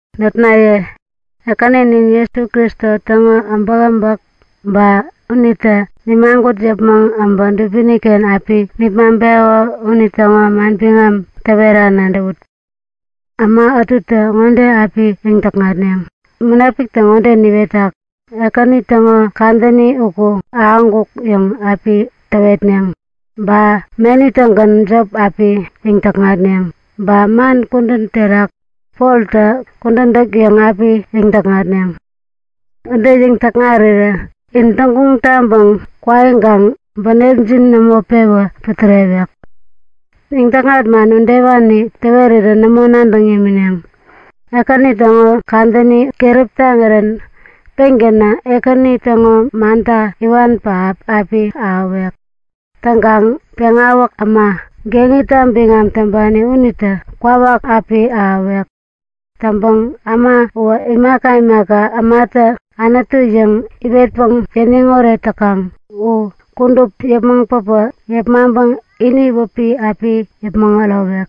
Notnaye, Ekäninin Jesu Kristo täŋo äbäkäbäk ba unitä nimagut yäpmäŋ päbä dubini-ken api nipmaŋpeko unitäŋo manbiŋam täwera nadäwut. Äma ätutä ŋode api yäŋ-täkŋatneŋ; Munapiktä ŋode niwetak; Ekäni täŋo kadäni uku ahäŋkuk yäŋ api täwetneŋ. Ba meni-tägän jop api yäŋ-täkŋatneŋ. Ba man kudän terak Poltä kudän täk yäŋ api yäŋ-täkŋatneŋ. Ude yäŋ-täkŋarirä in täŋguŋ taŋpäŋ kwaiŋkaŋ bänepjin nämo pewä putärewek. Yäŋ-täkŋat man udewani täwerirä nämo nadäŋ yämineŋ. Ekäni täŋo kadäni keräp taŋirän pengänä Ekäni täŋo manta iwan pähap api ahäwek. Täŋkaŋ Peŋawäk Äma, geŋita biŋam täŋpani unitä kwawak api ahäwek. Täŋpäŋ äma uwä imaka imaka ämatä anutu yäŋ iwetpäŋ yäniŋ oret täkaŋ u kudup yäpmäŋ päpä yepmaŋpäŋ ini wäpi api yäpmäŋ ärowek.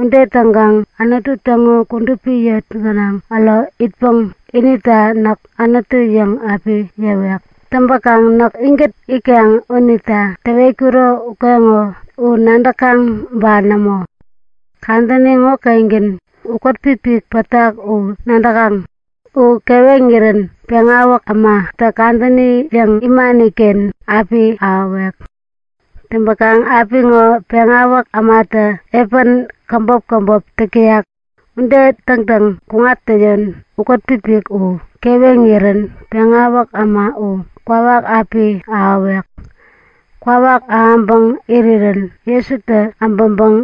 Ude täŋkaŋ Anutu täŋo kudupi yot gänaŋ äro itpäŋ inita Näk Anutu yäŋ api yäwek. Täŋpäkaŋ näk inkät itkaŋ unita täwetkuro ukeŋo u nadäkaŋ ba nämo? Kadäni ŋokengän ukät-pipik pätak u nadäkaŋ? U keweŋirän Peŋawäk Ämatä kadäni yäŋ imani-ken api ahäwek. Täŋpäkaŋ apiŋo Peŋawäk Ämatä epän käbop käbop täk täyak. Ude täŋtäŋ kuŋattäyon ukät-pipik u keweŋirän Peŋawäk Äma u kwawak api ahäwek. Kwawak ahäŋpäŋ irirän Jesutä äbäŋpäŋ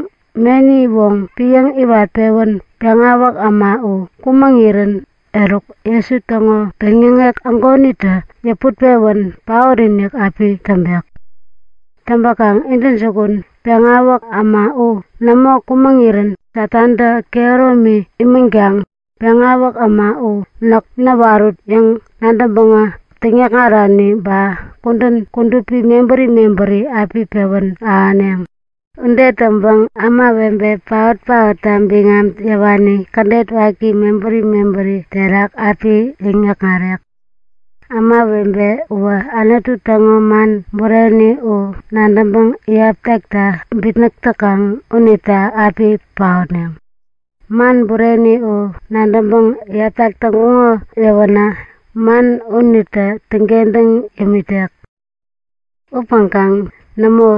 meni woŋ piäŋ-iwat-pewän Peŋawäk Äma u kumäŋirän eruk Jesu täŋo peŋyäŋek ägonitä yäput pewän paot-inik api täŋpek. Täŋpäkaŋ intäjukun, Peŋawäk Äma u nämo kumäŋirän Satantä kehäromi imänkaŋ Peŋawäk Äma u Näk näwarut yäŋ nadäŋpäŋä täŋyäkŋarani ba kudän kudupi mebäri mebäri api pewän ahäneŋ. Ude täŋpäŋ ämawebe paot-paotta biŋam yäwani kädet waki mebäri mebäri terak api täŋyäkŋarek. Ämawebe uwä Anutu täŋo man bureni u nadäŋpäŋ iyap takta bitnäk täkaŋ unita api paotneŋ. Man bureni u nadäŋpäŋ iyaptak täŋkuŋ yäwänä man unitä täŋkentäŋ yämitek. Upäŋkaŋ nämo!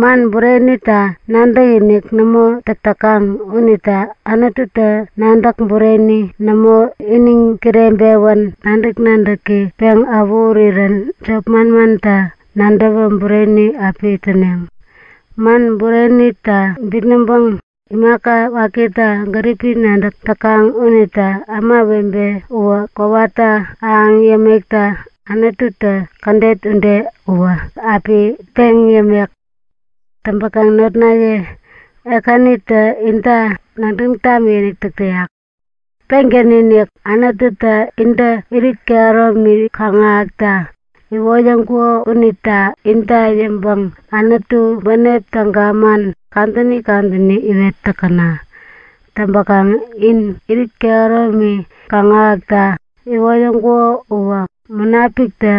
Man burenita nadäkinik nämo täk täkaŋ unita Anututä nadäk bureni nämo, iniŋ kireŋpewän nadäk-nadäki peŋ awähurirän jop manmanta nadäwä bureni api täneŋ. Man burenita bitnäŋpäŋ imaka wakita gäripi nadäk täkaŋ unita ämawebe uwä kowata ahäŋ yämekta Anututä kädet ude uwä api peŋ yämek. Täŋpäkaŋ notnaye, Ekänitä inta nadäŋ tamikinik täk täyak! Pengän-inik Anututä intä irit kehäromi kaŋ-ahäkta iwoyäŋkuko unita inta yäŋpäŋ Anutu bänep täga man kadäni kadäni iwet täkäna! Täŋpäkaŋ in irit kehäromi kaŋ-ahäkta iwoyäŋkuko uwä Munapiktä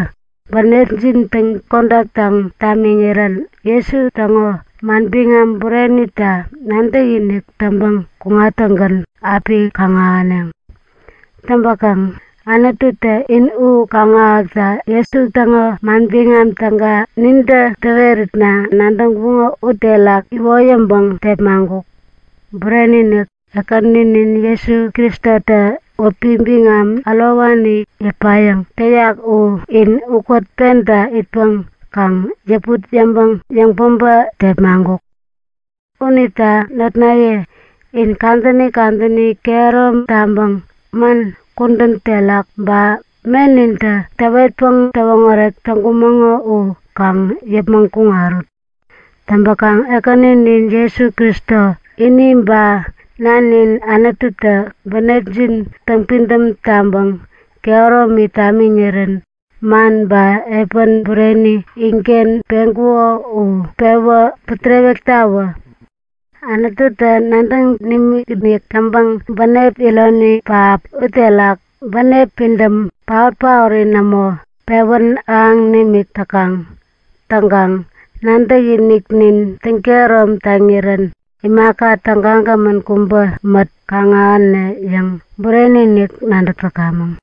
bänepjin täŋ-kodaktaŋ tamiŋirän Jesu täŋo manbiŋam burenita nadäkinik täŋpäŋ kuŋattäŋgän api kaŋ-ahäneŋ. Täŋpäkaŋ Anututä in u kaŋ-ahäkta Jesu täŋo Manbiŋam Täga nintä täweritna nadäŋkuŋo uterak iwoyäŋpäŋ tepmaŋkuk. Bureni-inik, Ekäninin Jesu Kristotä wäpi biŋam ärowani yäpayäŋ täyak u in ukät penta itpäŋ kaŋ yäput yäŋpäŋ yäŋpäbä tepmaŋkuk. Unita notnaye, in kadäni kadäni kehärom taŋpäŋ man, kudän terak ba menintä täwetpäŋ täwoŋärek täŋkumäŋo u kaŋ yäpmäŋ kuŋarut. Täŋpäkaŋ Ekäninin Jesu Kristo ini, ba Nanin Anututä bänepjin täŋpidäm taŋpäŋ kehäromi tamiŋirän man ba epän bureni inken peŋkuko u pewä putärewektawä! Anututä nadäŋ nimikinik täŋpäŋ bänep ironi pähap uterak bänep pidäm, paot-paori nämo, pewän ahäŋ nimik täkaŋ. Täŋkaŋ nadäkiniknin täŋkehärom taŋirän imaka tägagämän kubä mät kaŋ-ahäne yäŋ bureni-inik nadäk täkamäŋ.